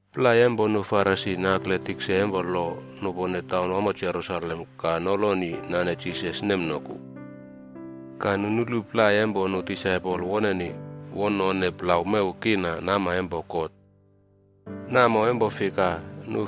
Plai empo nu Farisi nakle nu tikse empo lo nupone taunwamo Jerusalem ka noloni nane Jisas nemnoku. Ka nu nulu plai empo nu disaipol woneni won none plau mew kiina nama empo God. Namo empo fika,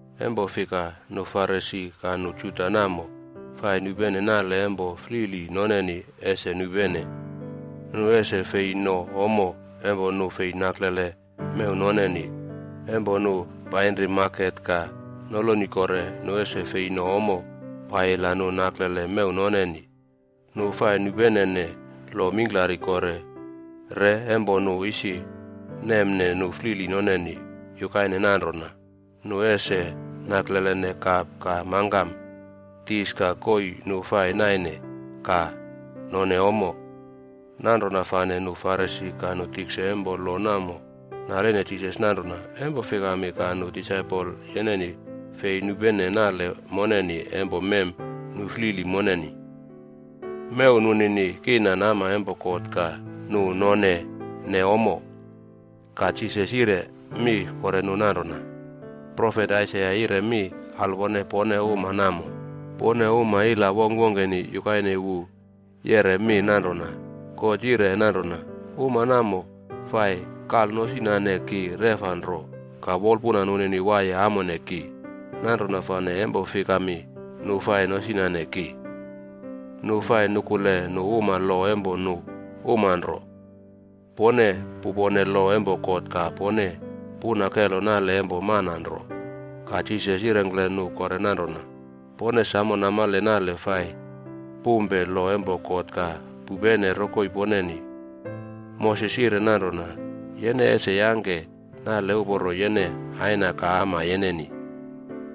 Empo fika, nu Farisi ka nu Juda namo fai nupene nale empo flili noneni ese nupene, nu ese fei no ommo empo nu fei naklele mew noneni. Empo nu painri maket ka noloni kore, nu ese fei no ommo paiyila nu naklele mew noneni. Nu fai nupenene lo mingklari kore re empo nu isi nemne nu flili noneni, yukaine nanrona, nu ese naklelene kap ka mangkam, dis ka koii nu fai naine ka none ommo. Nanrona fane nu Farisi ka nu tikse empo lo namo naline Jisas nanrona, “Empo fikami ka nu disaipol yeneni fei nupene nale moneni empo mem nu flili moneni? Mew nunini kiina nama empo God ka nu nonene ommo.” Ka Jisas yire mi kore nu nanrona, “Profet Aisaia yire mi alwone pone uma namo. Pone uma ila wongkwongkeni, yukaine wu yeꞌre mi nanrona, ‘God yire nanrona, “Uma namo fai kalnosinane ki reꞌfa nro, ka wolpuna nunini waiye amone ki. Nanrona fane empo fikami nu fai nosinane ki? Nu fai nukule nu uma lo empo nu uma nro.”’” “Pone pupone lo empo God ka pone puna kelo nale empo mana nro.” Ka Jisas yirengkle nu kore nanrona, “Pone samo namale nale fai pumpe lo empo God ka pupene rokoi poneni. Moses yire nanrona, ‘Yene ese yangke nale uporo yene aina ka ama yeneni.’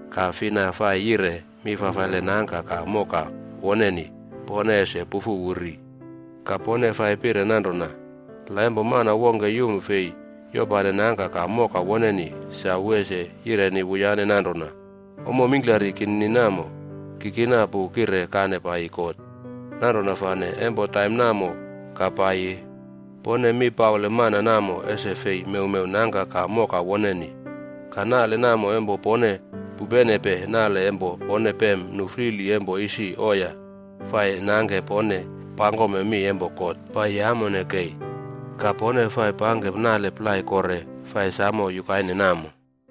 Ka ‘fina fai yire mi fafaile nangka ka moka woneni, pone ese pufu wu ri.’ Ka, pone fai pire nanrona, ‘La empo mana wongke yum fei yopane nangka ka moka woneni, sa wu ese yireni wuyane nanrona, “Ommo mingklari kinini namo, ki kina pu kire kane paiyi God.a” ’ Nanrona fane empo taim namo ka paiyi, pone mi paule mana namo ese fei mewmew nangka ka moka woneni. Ka nale namo empo pone pupenepe nale empo pone pem nu flili empo isi oiya, fai nangke pone pangkome mi empo God paiyi amone kei. Ka pone fai pangke nale plai kore fai samo yukaine namo.”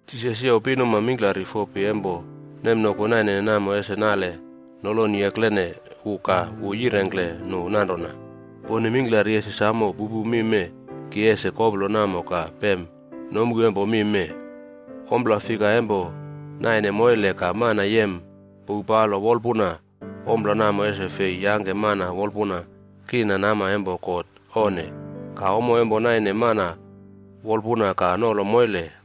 Jisas youw pinuma mingklari fopi empo nemnoku nainene namo ese nale noloni eklene wu ka wu yirengkle nu nanrona, “Pone mingklari ese samo pupu mi mee ki ese koplo namo ka pem nomu empo mi mee. Ompla fika empo naine moile ka mana yem pouw palo wolpuna, ompla namo ese fei yangke mana wolpuna kiina nama empo God, onne. Ka, ommo empo naine mana wolpuna ka nolo moile,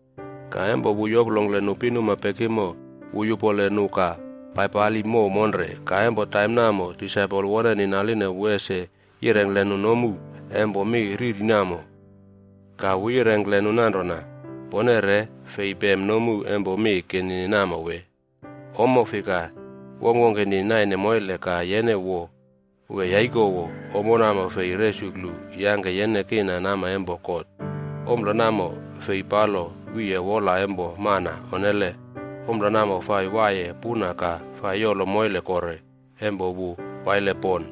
Ka empo wu yoplongkle nu pinuma pekimo, wu yupole nu ka paipali mow monre. Ka empo taim namo, disaipol woneni naline wu ese yirengkle nu nomu empo mi riri namo. Ka wu yirengkle nu nanrona, “Pone re fei pem nomu empo mi kinini namo wee? Ommo fika wongkwongkeni naine moile ka yene wo wee yaikowo, ommo namo fei resuklu yangke yene kiina nama empo God. Ompla namo fei palo wiye wola empo mana, onnele. Ompla namo fai waiye puna ka fai yolo moile kore empo wu waile pon.”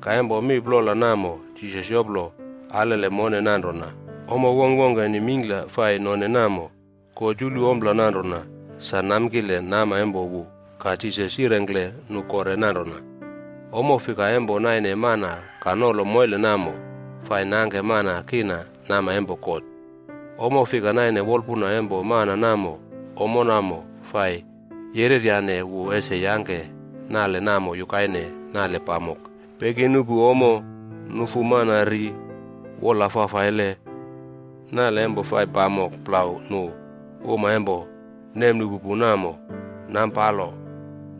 Ka empo mi plola namo Jisas yoplo alele mone nanrona ommo wongkwongkeni mingkla fai none namo, God yulu ompla nanrona sa namkile nama empo wu. Ka Jisas yirengkle nu kore nanrona, “Ommo fika empo naine mana ka nolo moile namo, fai nangke mana kiina nama empo God. Ommo fika naine wolpuna empo mana namo, ommo namo fai yereryane wu ese yangke nale namo yukaine, nale pamok, peki nuꞌpu ommo, nufu mana ri, wola fafaile, nale empo fai pamok plau nu uma empo nemnuꞌpu pu namo, nampalo,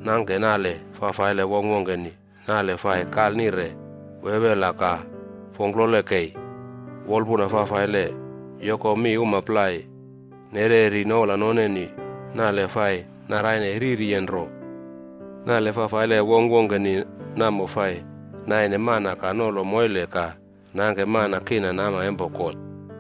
nangke nale fafaile wongkwongkeni, nale fai kalnire, wewela ka fongklole kei, wolpuna fafaile, yoko mi uma plai, nereri noula noneni, nale fai naraine ririyen nro. Nale fafaile wongkwongkeni namo fai naine mana ka nolo moile ka nangke mana kiina nama empo God.”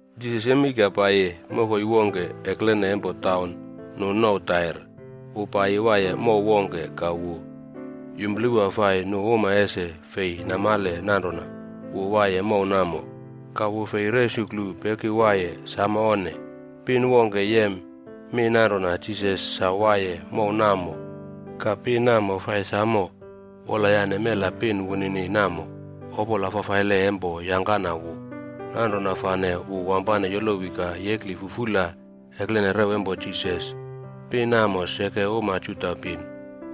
Jisas yemei ka paiyi mokoi wongke eklene empo taunwamo nu nouw Tair. Wu paiyi waiye mow wongke ka wu yumplewa fai nu uma ese fei namale nanrona wu waiye mow namo. Ka wu fei resuklu peki waiye, samo onne. Pin wongke yem mi nanrona Jisas sa waiye mow namo. Ka pin namo fai samo wolyane mela pin wunini namo, opola fafaile empo yangkana wu. Nanrona fane wu wampane yolowi ka yekli fufula eklene rew empo Jisas. Pin namo seke uma Juda pin.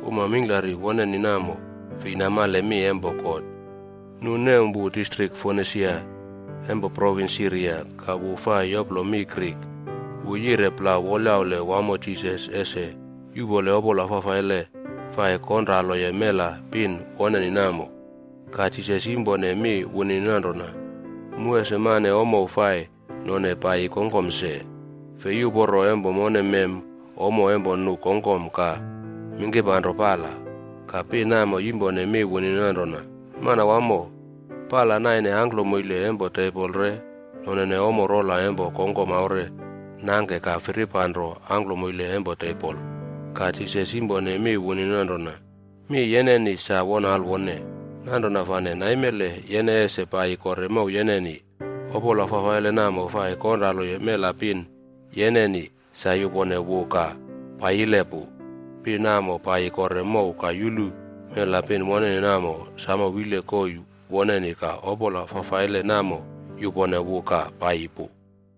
Uma mingklari woneni namo, fei namale mi empo God. Nu nem wu distrik Fonisia empo provins Siria. Ka wu fai yoplo mi “Grik.” Wu yire plau wolyaule wamo Jisas ese yuꞌpole opola fafaile fai konraloye mela pin woneni namo. Ka Jisas yimpone mi wunini nanrona, “Mu ese mane ommo fai none paiyi kongkom se. Fei uporo empo mone mem ommo empo nu kongkom ka mingkirpanro pala.d” Ka pin namo yimpone mi wunini nanrona, “Manawamo, pala naine angklomoile empo tebol re nonene ommo rola empo kongkom aure nangke ka firipanro angklomoile empo tebol.” Ka Jisas yimpone mi wunini nanrona, “Mi yeneni sa won alwone. Nanrona fane naimele yene ese paiyi kore mow yeneni. Opola fafaile namo fai konraloye mela pin yeneni, sa yupone wu ka paiyile pu.” Pin namo, paiyi kore mow ka yulu mela pin woneni namo, samo wile koii woneni ka opola fafaile namo yupone wu ka paiyi pu.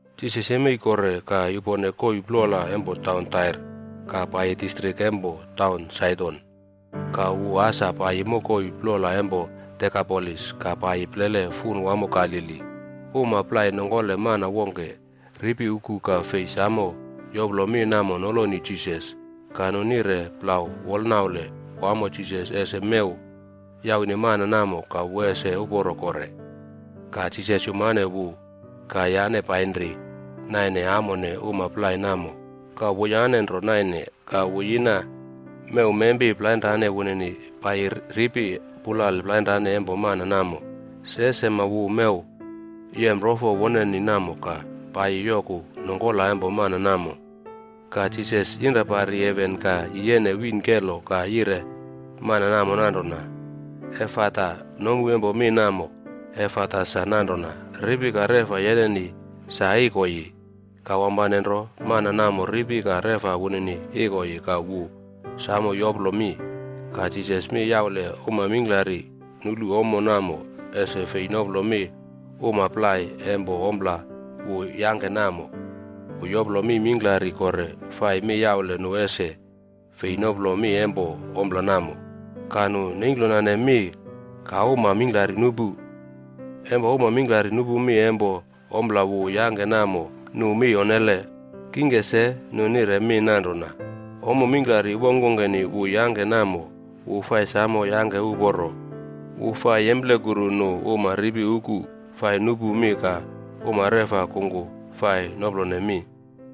Jisas yemei kore ka yupone koii plola empo taun Tair, ka paiyi distrik empo taun Saidon. Ka wu asa paiyi mokoi plola empo Dekapolis, ka paiyi plele fun wamo Galili. Uma plai nongkole mana wongke ripi uku ka fei samo yoplo mi namo noloni Jisas. Ka nu nire plau wolnaule wamo Jisas ese mew yaune mana namo ka wu ese uporo kore. Ka Jisas yumane wu ka yane painri naine amone uma plai namo, ka wuyane nro nainene. Ka wu yina mewmempi plainrane wunini paiyi ripi pulale plainrane empo mana namo. Se sema wu mew yem rofo woneni namo ka paiyi yoku nongkola empo mana namo. Ka Jisas yinra pari heven ka yiyene wiin kelo ka yire mana namo nanrona, “Efata.” Nomu empo mi namo “Efata” sa nanrona, “Ripi ka reꞌfa yeneni sa ikoiyi.” Ka wampane nro, mana namo ripi ka reꞌfa wunini ikoiyi ka wu samo yoplo mi. Ka Jisas mi yaule uma mingklari nulu ommo namo ese fei noplo mi uma plai empo ompla wu yangke namo. Wu yoplo mi mingklari kore fai mi yaule nu ese fei noplo mi empo ompla namo. Ka nu neingklonane mi ka uma mingklari nupu. Empo uma mingklari nupu mi empo ompla wu yangke namo, nu mi onnele. Kingke se, nu nire mi nanrona, “Ommo mingklari wongkwongkeni wu yangke namo, wu fai samo yangke uporo. Wu fai yemplekuru nu uma ripi uku fai nupu mi ka uma reꞌfa kungku fai noplone mi.”